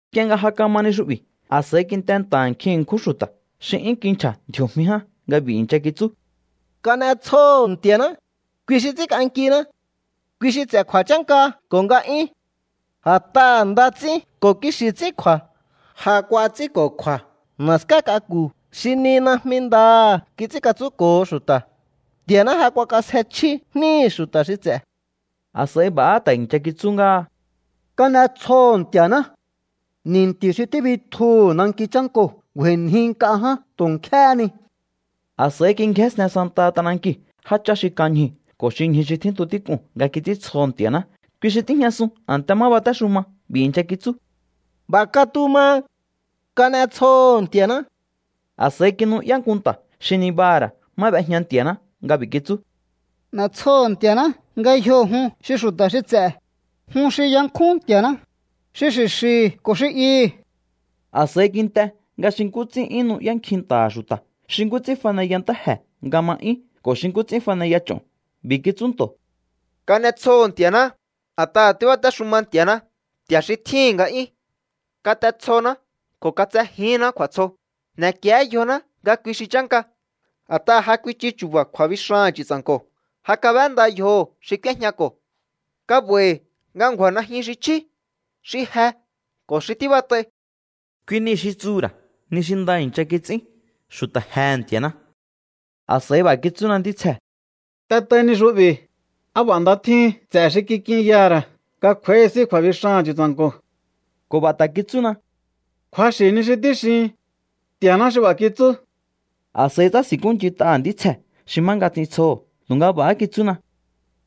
Nk'ie nga ja kama ni xu'bi̱, a̱s'a̱i kint'e nta̱ha̱ nkjin ṉkjún xu̱ta̱ xi 'yún kinchja̱ ndji̱o̱jmi ján nga b'i̱ i̱ncha kitsú: —¡Kan'etsjoho̱ Nti̱a̱ná, kui xi ts'ínk'ankiná! Kui xi ts'e̱ kju̱a̱chánka ko̱ nga'yún. A̱t'aha̱ nda ts'ín ko̱ kixi̱ ts'ín kju̱a̱, ja kuats'ínko̱kju̱a̱ na̱ská k'aku̱ xi ni najmi ndaha̱ kits'ínkatsúnko̱ho xu̱ta̱. Nti̱a̱ná ja kuakasje chjí jníhi̱ xu̱ta̱ xi ts'e̱. A̱s'a̱i b'a̱há ta̱ i̱ncha kitsú ngáha: —¡Kan'etsjoho̱ Nti̱a̱ná! Ni̱nti̱ xi tíbitjuhu̱ nanki chánkoo̱ ngju̱a̱i̱nji nk'a ján tu̱ nkjéhé ni. A̱s'a̱i kingjénsten santaha t'anankiu̱ jáchá xi kan ñjuu̱ ko̱ xi ñju xi tjíntu tík'uu̱n nga kits'íntsjoho̱ Nti̱a̱ná, kui xi tíjñasun a̱nte má batéxuma. B'i̱ i̱ncha kitsú: —¡B'a̱ katuma! ¡Kan'etsjoho̱ Nti̱a̱ná! A̱s'a̱i kinu'yá nku nta̱ xi nibaha̱ ra̱ má b'ejña Nti̱a̱ná nga b'i̱ kitsú: N'e̱tsjoho̱ Nti̱a̱ná ngayjo jun xi xu̱ta̱ xi ts'e̱, jun xi yankjún Nti̱a̱ná, xi xi̱xi̱hi̱ ko̱ xi ihi̱. A̱s'a̱i kint'e nga xi nkú ts'ín nu'yá nkjin nta̱ha̱ xu̱ta̱, xi nkú ts'ín faneya ntáje̱ nga ma 'yún ko̱ xi nkú ts'ín 'yún faneya ch'o̱n. B'i̱ kitsú nto̱: —¡Kan'etsjoho̱ Nti̱a̱ná! A̱t'aha̱ tíbatéxuma Nti̱a̱ná, Nti̱a̱ xi tjíhi̱n nga'yún. Kat'etsjoná ko̱ katsejíhinná kju̱a̱tsjo, n'e̱kié yjoná nga kui xi chánka. A̱t'aha̱ ja kuichu chu̱ba̱ kju̱a̱bixaha̱n Chu̱tsa̱nko̱, ja kab'énda yjoho̱ xi k'úéjñako̱. Ka'ba̱i̱hi̱ nga ngju̱a̱ najyun xi chjí, xi je ko̱ xi tíbat'ai. Kui niu̱ xi tsuhu̱ ra̱ ni xi nda i̱ncha kits'ín xu̱ta̱ jehe̱ Nti̱a̱ná. A̱s'a̱i b'a̱ kitsúna ntítsjee̱: —T'et'ai ni xu'bi̱: “¡Á b'a̱ nda tjíhin ts'e̱ xi kik'inyaha̱ ra̱ nga kj'u̱a̱íhi s'í kju̱a̱bixaha̱n Chu̱tsa̱nko̱!” Ko̱ b'a̱ ta̱ kitsúna: —Kju̱axi̱ ni xi tíxihin. Nti̱a̱ná xi b'a̱ kitsú. A̱s'a̱i tsási̱nkúnch'int'aha̱ ntítsjee̱ xi má nga ts'intsjoho̱, tu̱nga b'a̱há kitsúna: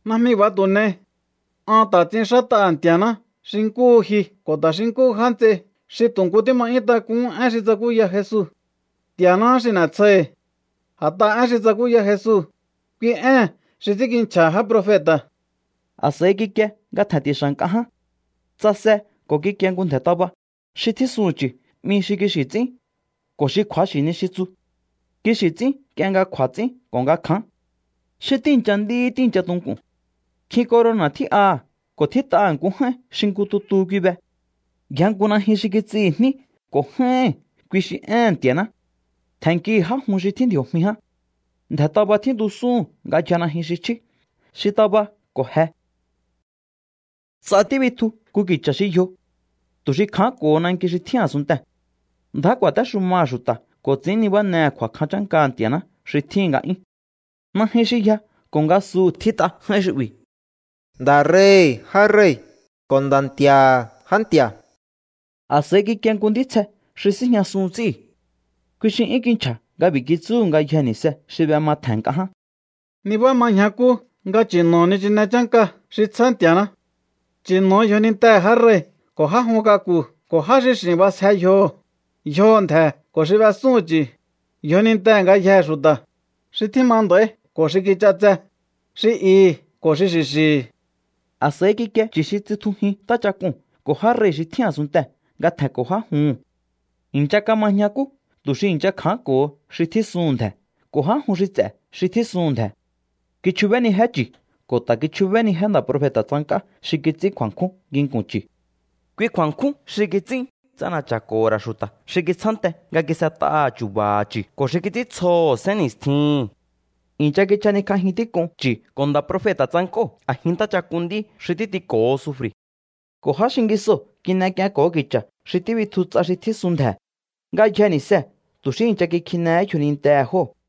—Najmi b'a̱ tu̱ n'ei. An ta̱ ts'inxát'aha̱ Nti̱a̱ná xi nkúhu ji ko̱ ta̱ xi nkúhu já nts'ei xi tu̱ nkú tíma 'yún tak'uhún én xi tsakúya Jesu. Nti̱a̱náhá xi n'e̱tsjoihi̱. A̱t'aha̱ én xi tsakúya Jesu, kui ée̱n xi ts'ínkinchja̱ha̱ já profeta̱. A̱s'a̱i kikie nga tje̱nti̱xa̱ nk'a ján. Tsase ko̱ kikie nku ndje̱ taba. Xi tjísuhu̱n chu̱ 'mi Xi Kixi̱ Ts'ín ko̱ Xi Kju̱axi̱ Ni xi Tsu. Kixi̱ ts'ín nk'ie nga kju̱a̱ ts'ín ko̱ nga kján. Xi tíi̱ncha nd'í tíi̱ncha tunku̱n. Nkjin corona̱ tjí'aha̱ ko̱ tjít'aha̱ nku j'áín xi nku tutu kui be. Yja nku najyun xi kits'ihi̱ jní ko̱ j'áíhi̱n, kui xi Éhe̱n Nti̱a̱ná. Tje̱nnkihi̱ já jun xi tjín ndji̱o̱jmi ján. Ndje̱ taba tjíntusúhu̱n nga yja najyun xi chjí, xi taba ko̱ je. Ts'a tíbitju nku ki̱cha̱ xi yjo, tu̱ xi kja̱ánko̱ho nanki xi tjín a̱sunntee̱. Ndjá ku̱a̱téxumaha̱ xu̱ta̱ ko̱ ts'i̱ín nibánehe̱ kju̱a̱kjan chánkaha̱ Nti̱a̱ná xi tjíhi̱n nga'yún. Najyun xi yja ko̱ ngasuhu̱ tjít'a j'áín xu'bi̱: “Nda̱ rei̱hi̱ já rei̱ ko̱ Nda̱ Nti̱a̱ha̱ já nti̱a̱.” A̱s'a̱i kikie nku ntítsje xi síjñasun ts'íu̱. Kui xi 'yún kinchja̱ nga b'i̱ kitsúhu̱ ngayjee̱ ni̱se xi b'ema tje̱n nk'a ján: —Nibá ma ñjakú nga chi̱no̱o nichine chánka xi tsjá Nti̱a̱ná. Chi̱no̱o yjonintehe̱ já rei̱ ko̱ já jun k'aku̱ ko̱ já xi x'i̱n b'asje yjoho̱, yjoho̱ ndje̱ ko̱ xi b'esúhu̱n chu̱, yjonintehe̱ ngayjee̱ xu̱ta̱, xi tjíma nda̱íhi̱ ko̱ xi kich'atse, xi ihi̱ ko̱ xi xi̱xi̱hi̱. A̱s'a̱i kikie chu̱ xi tsitjujín ntáchak'uu̱n ko̱ já rei̱ xi tjín a̱sunntee̱ nga tje̱nko̱ já juhu̱n. I̱ncha kama ñjakú tu̱ xi i̱ncha kja̱ánko̱ho xi tjísuhu̱n ndje̱ ko̱ já jun xi ts'e̱ xi tjísuhu̱n ndje̱. Kichjubénijé chi̱ ko̱ ta̱ kichjubénijé nda̱ profeta̱ tsank'á xi kits'ín kju̱a̱nkjún nginku̱n chi̱. Kui kju̱a̱nkjún xi kits'ín ts'ana̱cha̱ko̱ho̱ ra̱ xu̱ta̱ xi kitsjánte nga kis'et'aha̱ chu̱ba̱ha̱ chi̱ ko̱ xi kits'íntsjoho̱ sénni̱stjihi̱n. I̱ncha kichjanikj'ajin tík'un chi̱ ko̱ nda̱ profeta̱ tsank'óo̱ a̱jin ntáchak'un nd'í xi títiko̱ho sufri̱. Ko̱ já xingisoo̱ kin'ek'ienko̱ho ki̱cha̱ xi tíbitju ts'a xi tjísun ndje̱. Ngayjee̱ ni̱see̱ tu̱ xí i̱ncha kikjinehé yjonintehe̱ jóo̱.